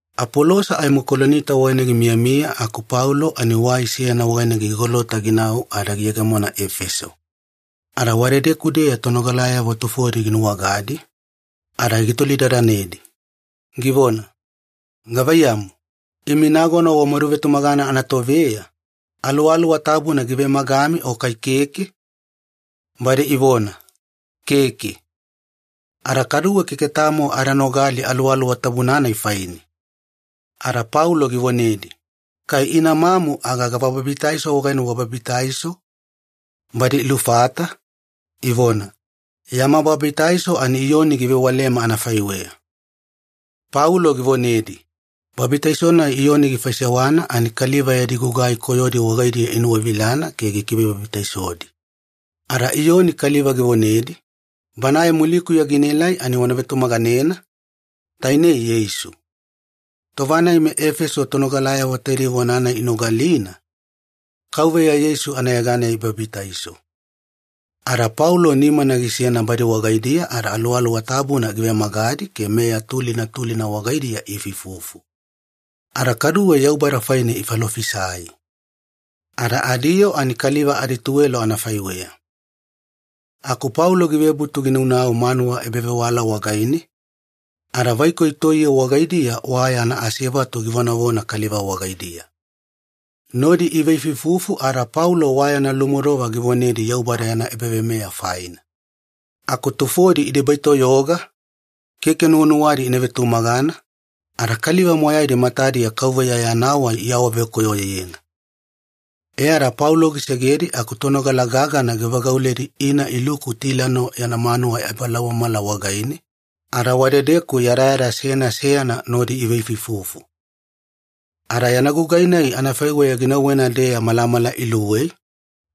Apolosa aimo Kolinita wagaine gimiyamiya aku Paulo ani wai seyana wagaine gigolota ginau ada giyegemona Efeso. Ada wadedeku-deya tonogalayavo tufodi ginuwagadi, ada gitolidadanedi, givona, “Gavaiyamu, imi nagona wamaduvetumagana anatoveya, Aluwaluwa Tabuna givemagami o kai keke?” Badi ivona, “Keke. Ada kaduwe keke tamo ada nogali Aluwaluwa Tabuna-nai faine.” Ada Paulo givonedi, “Kai ina mamu aga gava babitaiso wagaine wababitaiso?” Badi ilufata, ivona, “Yama babitaiso ani Iyoni givewalema anafaiweya.” Paulo givonedi, “Babitaiso-nai Iyoni gifaisewana ani kaliva yadi gugai koyodi wagaidiya inuwavilana ke gikivebabitaisodi. Ada Iyoni kaliva givonedi, ‘Banae mulikuya ginaelai ani wana vetumaganena, tainei Yeisu.’” Tova-nai meEfeso tonogalayavo taidei vona-nai inogalina, Kauveya Yeisu anayeganeya ibabitaiso. Ada Paulo nimana gisena badi wagaidiya ada Aluwaluwa Tabuna givemagadi ke meya tulina tulina wagaidiya iifuifufu. Ada kaduwe Yaubada faine ifalofisai. Ada adiyoo ani kaliva adituwelo anafaiweya. Aku Paulo givebutu ginaunau manuwa ebavewala wagaine, ada vaikoi toiye wagaidiya wa yana asevatu givonavona kaliva wagaidiya. Nodi iveifuifufu ada Paulo wa yana lumodova givonedi Yaubada yana ebaveimeya faina. Aku tufodi idebaitoyoga, keke nuwanuwadi ina vetumagana, ada kaliva moyaidi matadiya Kauveya Yana Wai iawavekoyoyena. E ada Paulo gisegedi aku tonogala gagana givagauledi ina iluku Tilano yana manuwa ebalaumamala wagaine, ada wadedeku yadayada seyana seyana nodi iveifuifufu. Ada yana gugai-nai anafaiweya ginauwena-deya malamala iluwei,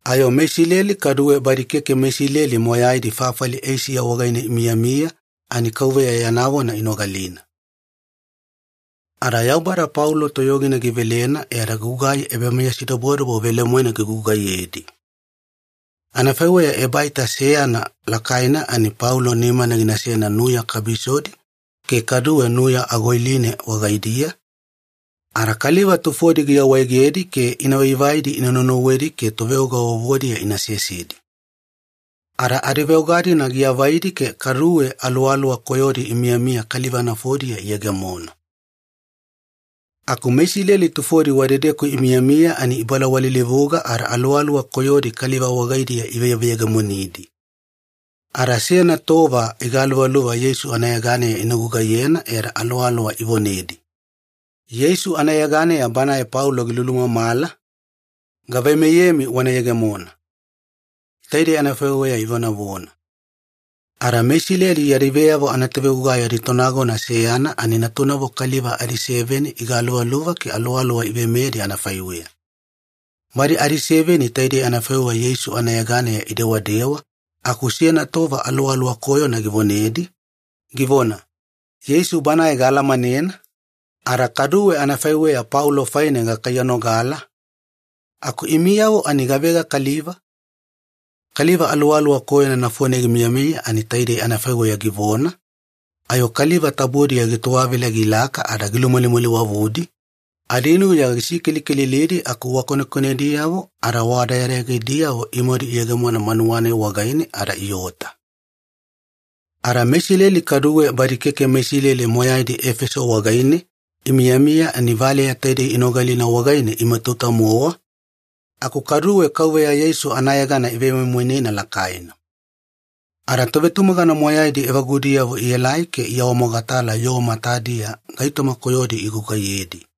ayo meIsileli kaduwe badi keke meIsileli moyaidi fafali Eisiya wagaine imiyamiya ani Kauveya yana vona inogalina. Ada Yaubada Paulo toyogina givelena e ada gugai ebameyasidobodobo velemoena gigugaiyedi. Anafaiweya ebaita seyana lakaina ani Paulo nimana ginasena nuya kabisodi ke kaduwe nuya agoiline wagaidiya, ada kaliva tufodi giawaegedi ke ina vaivaidi ina naunauwedi ke toveoga vovodiya ina sesedi. Ada adiveoga-dina giavaidi ke kaduwe aluwaluwa koyodi imiyamiya kaliva nafodiya iyegemona. Aku meIsileli tufodi wadedeku imiyamiya ani ibalawalilivuga ada aluwaluwa koyodi kaliva wagaidiya iveveyegemonidi. Ada seyana tova igaluvaluva Yeisu anayeganeya ina gugaiyena e ada aluwaluwa ivonedi, “Yeisu anayeganeya banae Paulo gilulumamala, gaveimeyemi wana yegemona.” Taidei anafaiweya ivonavona. Ada meIsileli yadi veyavo anatovegugai aditonagona seyana ani natunavo kaliva adiseveni igaluvaluva ke aluwaluwa iveimeyedi anafaiweya. Badi adiseveni taidei anafaiweya Yeisu anayeganeya idewadewa aku seyana tova aluwaluwa koyona givonedi, givona, “Yeisu Banae gaalamanena, ada kaduwe anafaiweya Paulo faine gakaiyanogala, aku imiyavo ani gavega kaliva?” Kaliva aluwaluwa koyona nafone gimiyamiya ani taidei anafaiweya givona, ayo kaliva tabodiya gitowavila gilaka ada gilumalimaliwavudi, adinuya gisikelikelilidi aku wa konekonediyavo ada wa dayadayagidiyavo imadu iyegemona manuwa-nai wagaine ada iota. Ada meIsileli kaduwe badi keke meIsileli moyaidi Efeso wagaine imiyamiya ani valeya taidei inogalina wagaine imatauta-mowa, aku kaduwe Kauveya Yeisu anayegana ivemoimoinena lakaina. Ada tovetumagana moyaidi evagudiyavo ielai ke iawamogatala yoo matadiya gaitoma koyodi igugaiyedi.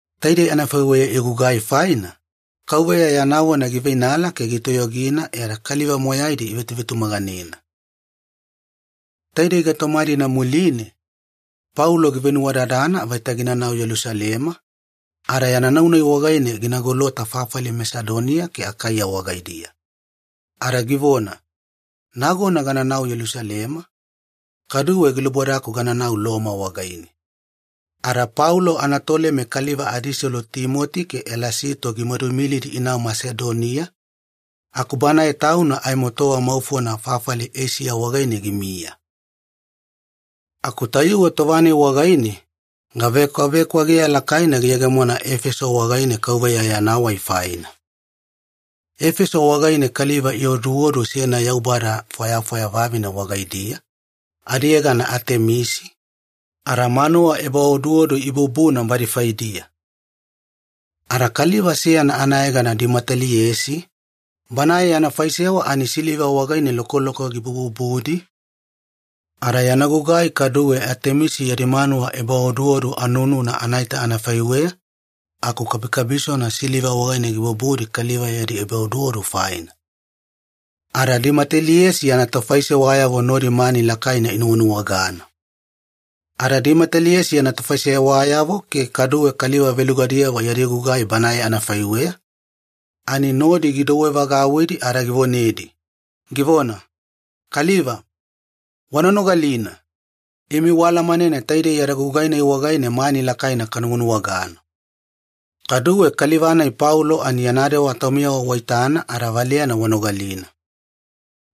Taidei anafaiweya igugai faina, Kauveya yana vona giveinala ke gitoyogina e ada kaliva moyaidi ivetuvetumaganena. Taidei gaitoma-dina muline, Paulo givenuwadadana vaita ginanau Yelusalema, ada yana nau-nai wagaine gina golota fafali Masedonia ke Akaiya wagaidiya. Ada givona, “Nagona gananau Yelusalema, kaduwe gilubodaku gananau Loma wagaine.” Ada Paulo anatoleme kaliva adiselu Timoti ke Elasito gimaduimilidi inau Masedonia, aku banae tauna aimo tova maufona fafali Eisiya wagaine gimiya. Aku tayuwe tova-nai wagaine, gavekwavekwageya lakaina giyegemona Efeso wagaine Kauveya Yana Wai faina. Efeso wagaine kaliva ioduodu seyana yaubada fwayafwaya vavine wagaidiya, adiyegana Atemisi, ada manuwa ebaoduodu ibubuna badi faidiya. Ada kaliva seyana anayegana Dimeteliesi, banae yana faisewa ani siliva wagaine lokoloko gibububudi, ada yana gugai kaduwe Atemisi yadi manuwa ebaoduodu anununa anaita anafaiweya aku kabikabisona siliva wagaine gibububudi kaliva yadi ebaoduodu faina. Ada Dimeteliesi yana tofaisewayavo nodi mani lakaina inuwanuwagana. Ada Dimeteliesi yana tofaisewayavo ke kaduwe kaliva velugadiyavo yadi gugai banae anafaiweya, ani nodi gidouwevagauwidi ada givonedi, givona, “Kaliva, wana nogalina! Imi waalamanena taidei yada gugai-nai wagaine mani lakaina kanuwanuwagana. Kaduwe kaliva-nai Paulo ani yana dewa taumiyavo waitana ada valeyana wanogalina.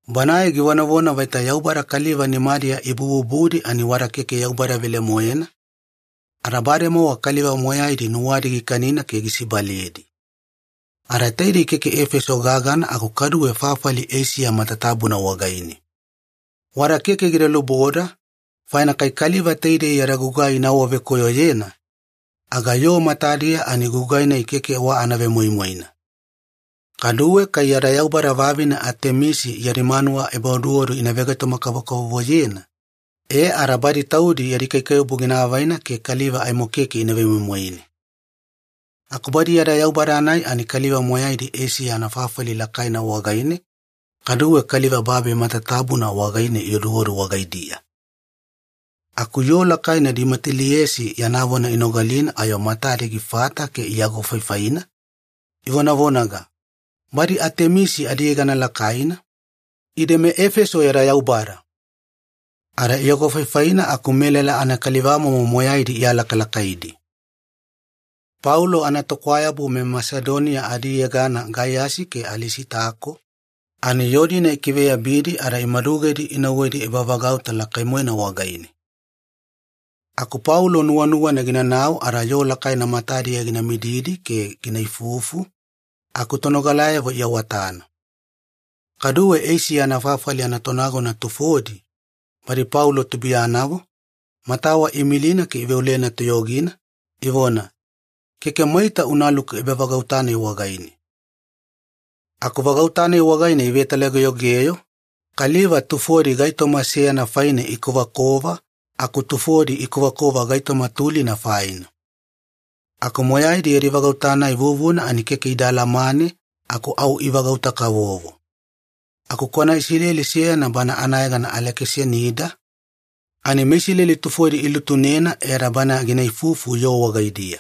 Banae givonavona vaita yaubada kaliva nimadiya ibububudi ani wada keke yaubada velemoena, ada bademowa kaliva moyaidi nuwadi gikanina ke gisibaledi. Ada taidei keke Efeso gagana aku kaduwe fafali Eisiya matatabuna wagaine. Wada keke gida luboda, faina kai kaliva taidei yada gugai ina awavekoyoyena, aga yoo matadiya ani gugai-nai keke wa anavemoimoina. Kaduwe kai yada yaubada vavine Atemisi yadi manuwa ebaoduodu ina vegaitoma-kavokavovoyena, e ada badi taudi yadi kaikaiwabu gina avaina ke kaliva aimo keke ina vemoimoine. Aku badi yada yaubada-nai ani kaliva moyaidi Eisiya anafafali lakaina wagaine kaduwe kaliva babi matatabuna wagaine ioduodu wagaidiya.” Aku yoo lakaina Dimeteliesi yana vona inogalina ayo matadi gifata ke iagofaifaina, ivonavonanaga, “Badi Atemisi adiyegana lakaina, ide meEfeso yada yaubada!” Ada iagofaifaina aku melala anakalivamomo moyaidi ialakalakaidi. Paulo anatokwayabu meMasedonia adiyegana Gaiyasi ke Alisitako, ani yoo-dina ikiveyabidi ada imadugedi inauwedi ebavagauta lakai-moena wagaine. Aku Paulo nuwanuwana ginanau ada yoo lakaina matadiya gina mididi ke gina ifufu, aku tonogalayavo iawatana. Kaduwe Eisiya anafafali anatonagona tufodi, badi Paulo tubuiyanavo, matawa iimilina ke iveolena toyogina, ivona, “Keke maita unaluku ebavagauta-nai wagaine.” Aku vagauta-nai wagaine ivetalageyogeyo, kaliva tufodi gaitoma seyana faine ikovakova aku tufodi ikovakova gaitoma tulina faina. Aku moyaidi yadi vagauta-nai vuvuna ani keke ida alamane aku au ivagauta-kavovo. Aku kwana Isileli seyana bana anayegana Alekisanida, ani meIsileli tufodi ilutunena e ada bana gina ifufu yoo wagaidiya.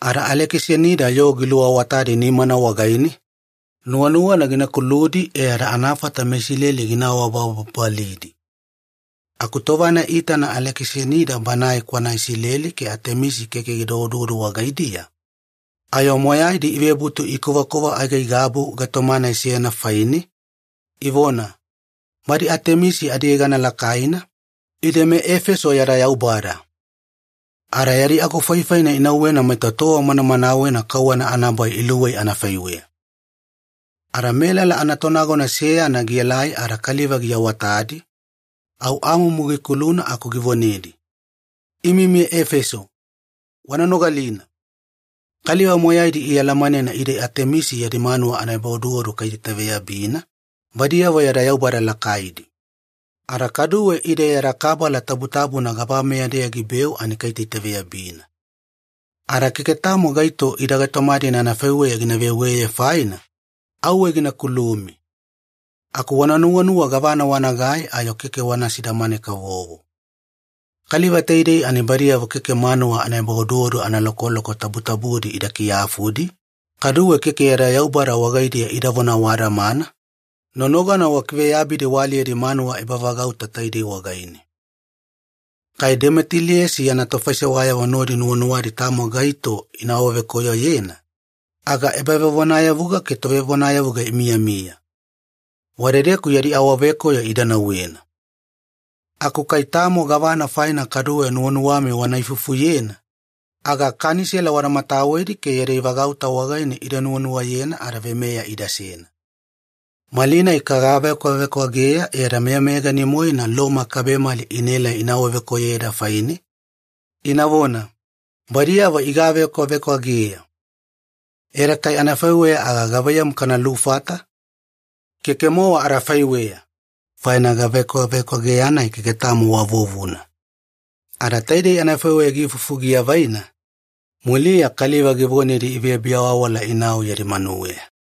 Ada Alekisanida yoo giluawatadi nimana wagaine, nuwanuwana gina kuludi e ada anafata meIsileli gina awabababalidi. Aku tova-nai iitana Alekisanida banae kwana Isileli ke Atemisi keke gida oduodu wagaidiya, ayo moyaidi ivebutu ikovakova aigaigabu gaitoma-nai seyana faine, ivona, “Badi Atemisi adiyegana lakaina, ide meEfeso yada yaubada!” Ada yadi agofaifaina inauwena maita tova manamanawena kauwana anabai iluwei anafaiweya. Ada melala anatonagona seyana gielai ada kaliva giawatadi, au amumu gikuluna aku givonedi, “Imi meEfeso, wana nogalina! Kaliva moyaidi ialamanena ide Atemisi yadi manuwa ebaoduodu kaitaitaveyabina, badiyavo yada yaubada lakaidi. Ada kaduwe ide yadi kabala tabutabuna gabameya-deya gibeu ani kaitaitaveyabina. Ada keke tamo gaito ida gaitoma-dina anafaiweya gina veweye faina, auwe gina kulumi. Aku wana nuwanuwa gavana wanagai ayo keke wana sidamane-kavovo. Kaliva taidei ani badiyavo keke manuwa ebaoduodu analokoloko tabutabudi ida kiyafudi, kaduwe keke yada yaubada wagaidiya idavona awadamana, nonogana wakiveyabidi waaliyedi manuwa ebavagauta taidei wagaine. Kai Dimeteliesi yana tofaisewayavo nodi nuwanuwadi tamo gaito ina awavekoyoyena, aga ebavevonayavuga ke tovevonayavuga imiyamiya. Wadedeku yadi awavekoyo ida nauwena. Aku kai tamo gavana faina kaduwe nuwanuwami wana ifufuyena, aga kanisela wada matawedi ke yadi vagauta wagaine ida nuwanuwayena ada veimeya idasena. Malinai kagavekwavekwageya e ada meyameyagani-moena Loma kabemali inaela ina awavekoyoyeda faine, inavona, ‘Badiyavo igavekwavekwageya.’ E ada kai anafaiweya aga gavaiyamu kana lufata? Keke-mowa adafaiweya, faina gavekwavekwageya-nai keke tamo wa vuvuna.” Ada taidei anafaiweya giifufu giavaina, muliya kaliva givonedi ivebiawawala inau yadi manuweya.